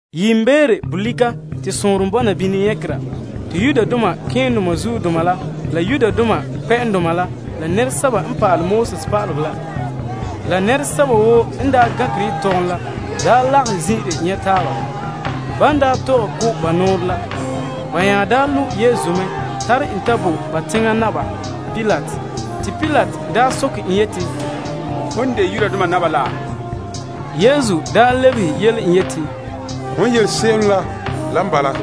Yiimbeere bolika, te sɔɔnrom bɔna bini nyagera te malema keendoma la Yudoma kpɛ'ɛndoma la pa'alegɔ pa'aleba la Yetɔgom Tɔgɔrɔba daa lagahɛ zin'ire nyɛ' taaba. Ban daa tɔgɛ ko' ba nɔɔrɛ la, ba nya daa lo' Yesu mɛ tare en ta bo Pilate. Pilate soke en yeti, Hom n de Yudoma naba la? Te Yesu lebehe yele en yeti, Hon yele se'em la, lan bala.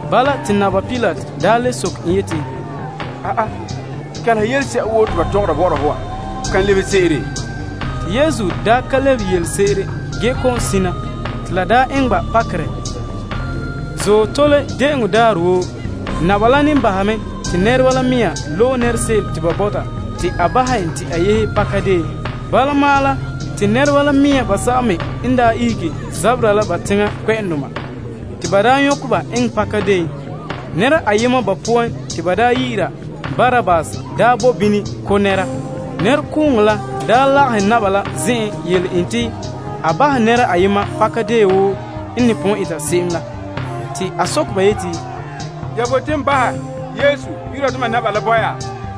Bala, te Pilate le soke en yeti, Kɛleha yelese'a woo te ba tɔgɔra bɔ'ɔra ho wa. Ho kan lebehe se'ere? Ge Yesu ka lebehe yelese'ere ge kɔ'ɔn sina, te la daa eŋɛ Pilate la pakerɛ. De'eŋɔ daarɛ naba la ne bahɛ mɛ te nɛreba la mea loe nɛra se'em te ba bɔta te a bahɛ te a yehe pakadeen. Bala ma'an la, te nɛreba mea basɛba me n daa ihege zabera la ba teŋa kpɛ'ɛndoma te ba daa nyɔkɛ ba eŋɛ pakadeen. Ge nɛra ayema ba poan te ba daa yi'ira Barabase daa bo bini zabɛ ko' nɛra. Nɛrekooŋɔ la daa lagahɛ Pilate la zen'en yele en te a bahɛ nɛra ayema pakadeen wo n ne pon eta se'em la. Pilate soke ba yeti, Ya bote n bahɛ Yudoma naba la bo ya?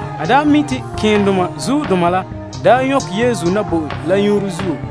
A mi' te malema keendoma la daa nyɔkɛ Yesu na bo en la nyuunre zuo.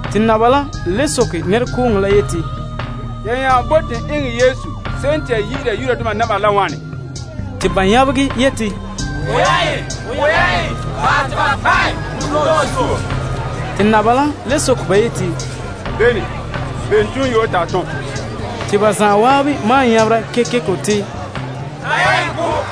Pilate le soke nɛrekooŋɔ la yeti, Ya nya bote n eŋɛ Yesu se'em te ya yi'ira Yudoma naba wa la wane? Te ba nyabegɛ yeti, Bahɛ te ba kpa' en punpuuredɔɔ zuo. Pilate le soke ba yeti, Bene zuo? Bene toonyoo te a tom? Te ba zan'an maan nyabera kekeko te, Kpa' ya en.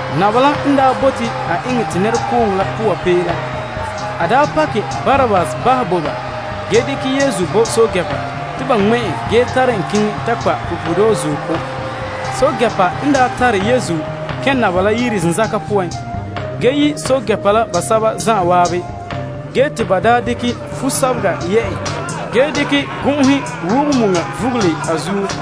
Pilate la n daa bote a eŋɛ te nɛrekooŋɔ la poa pee la, a daa pakɛ Barabase bahɛ bo, ba ge gee dekɛ Yesu bo pɛɛntɛɛnreba te ba ŋmɛ' en ge tare en keŋɛ ta kpa' punpuuredɔɔ zuo. Pɛɛntɛɛnreba tare Yesu kɛn' naba la yire zenzaka poan ge yi' pɛɛntɛɛnreba la basɛba zan'an, Ba dekɛ fumɔlɔga yɛ' en ge dekɛ gɔn'ɔhe wɔgɛ muŋa vugule a zuo,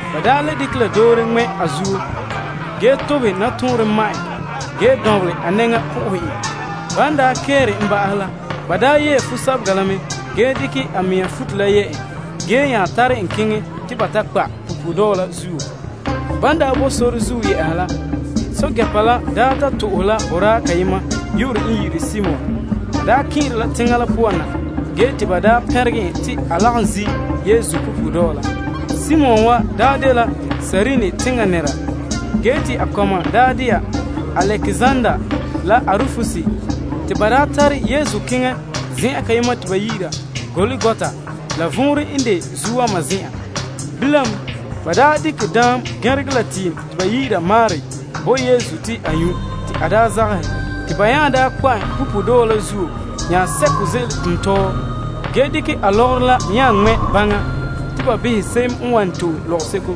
Ba le dekɛ la doore ŋmɛ' a zuo ge tobehɛ nɔtɔɔnrom ma' en gee dɔnbelɛ a nɛŋa po'ohɛ en. Ban kɛɛte en ba'ahɛ la, ba yɛɛ fumɔlɔga la mɛ ge dekɛ a mɛŋa futo la yɛ' en ge nya tare en keŋɛ te ba ta kpa' en punpuuredɔɔ la zuo. Ban bo sore zuo yɛ'a la, ba ta to'ohɛ la boraa kayema yu'urɛ n de Simon kɛn'ɛra teŋa la poan na. Te ba pɛnregɛ en te a lagom zi' Yesu punpuuredɔɔ la. Simon wa dela Kirene teŋa nɛra ge te a kɔma de'a Alekzander la Arufus. Ba tare Yesu keŋɛ zen'an kayema te ba yi'ira Golgota, la vɔnrɛ n de Zuowama Zen'an. Ba nya dekɛ daam gɛnregɛ la tiim te ba yi'ira muur bo Yesu te a nyu' te a daa zagahɛ. Ba nya kpa' en punpuuredɔɔ la zuo ge dekɛ a lɔgɔrɔ la nya ŋmɛ' gbaŋa te ba behɛ se'em n wan to'e lɔgɔseko.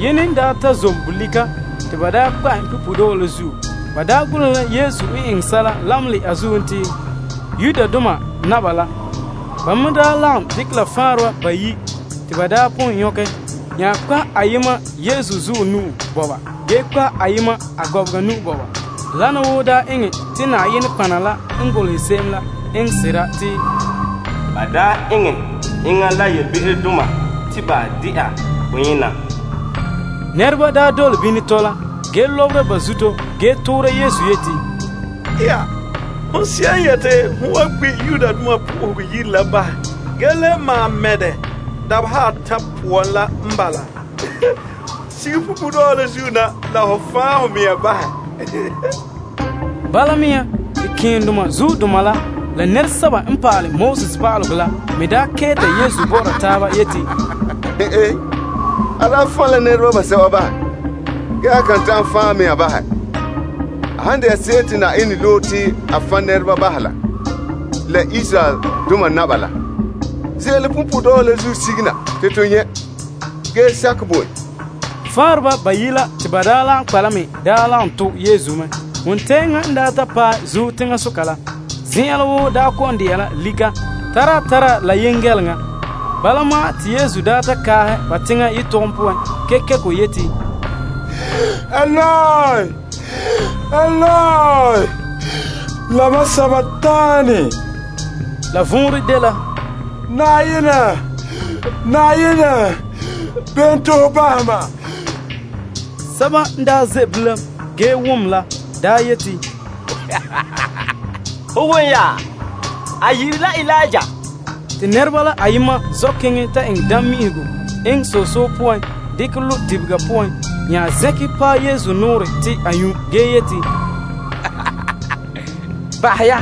Yene n ta zom bolika te ba kpa' en punpuuredɔɔ la zuo. Ba golehɛ la Yesu n eŋɛ sɛla lamenɛ a zuen te: Yudoma Naba. Ba me lagom dekɛ la faanreba bayi' te ba daa pon nyɔkɛ, nya kpa' ayema Yesu zuɔ ge kpa' ayema me a gɔbega. Wana woo daa eŋɛ te la n daa golehɛ se'em la eŋɛ sera te, Ba daa eŋɛ enŋa la yelebe'erodoma te ba de'a boyena. Nɛreba n dole bini tɔla gee lɔbera ba zuto ge toora Yesu yeti, Hon se'em n yeti, ho wan gbi' Yenɛ Yire la bahɛ ge le maan mɛ' dɛ dabeha atan' poan la n bala, sige punpuuredɔɔ la zuo na, la ho fan' ho mɛŋa bahɛ. Bala mea te malema keendoma la pa'alegɔ pa'aleba la me kɛɛta Yesu bɔ'ɔra taaba yeti, A daa fan' la nɛreba basɛba bahɛ, ge a kan ta'an fan' a mɛŋa bahɛ. Bahɛ te Krista, Israeldoma Naba la, ze'ele punpuuredɔɔ la zuo sige na te to nyɛ' gee sakɛ bo en. Ge faanreba bayi' la te ba daa lagom kpa' la me daa lagom to' Yesu mɛ. Wontɛɛŋa n ta paɛ zuo teŋasoka la zen'an woo daa kɔ'ɔn de'a la lika tara tara la yengɛleŋa. Bala ma'an Yesu ta kaahɛ ba teŋa yetɔgom poan kekeko yeti, Eloi, Eloi, lama sabakanii? La vɔnrɛ dela, Mam Yenɛ, mam Yenɛ bene zuo te ho zagaha mam? Sɛba n ze' bilam ge wom la yeti, Ho won ya? A yi'ire la Eliya. Te nɛreba la ayema zɔ' keŋɛ ta eŋɛ daam mi'ihego eŋɛ soso poan dekɛ lo' dibega poan nya zɛnkɛ paɛ Yesu nɔɔrɛ te a nyu' ge yeti, Bahɛ ya,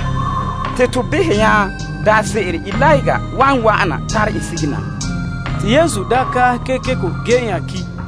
te to behɛ nya daanse'ere Eliya wan wa'ana tare en sige na. Te Yesu kaahɛ kekeko ge nya ki'.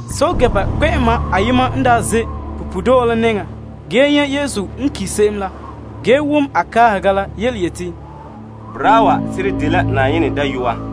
Pɛɛntɛɛnreba la kpɛ'ɛma ayema n ze' punpuuredɔɔ la nɛŋan ge nyɛ' Yesu n ki' se'em la, a yeti, Boraa wa seren dela Yenɛ Dayɔa.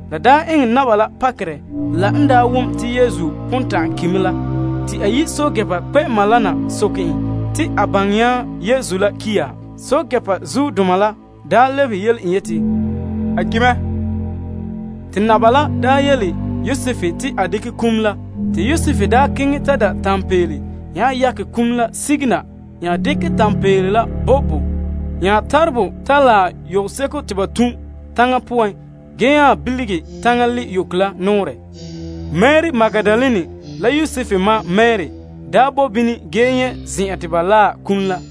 La eŋɛ Pilate la pakerɛ n daa ta wom te Yesu pon ta'an ki' mɛ la. Te a yi' pɛɛntɛɛnreba kpɛ'ɛma la na soke en te a baŋɛ nya te Yesu la ki' ya. Pɛɛntɛɛnreba kpɛ'ɛma la lebehe yele en yeti, A ki' mɛ. Te naba la yele Yosef te a ta dekɛ kum la. Te Yosef keŋɛ ta da' tanpeele nya yakɛ kum la sige na nya dekɛ tanpeele la pɔnbɛ bɔ nya tare bɔ ta laɛ yɔseko te ba tun' taŋa poan gee nya bilige taŋa li' yoko la nɔɔrɛ. Mari Magdalene la Yosef ma Mari bo bini mɛ ge nyɛ' zen'an te ba biŋe kum la.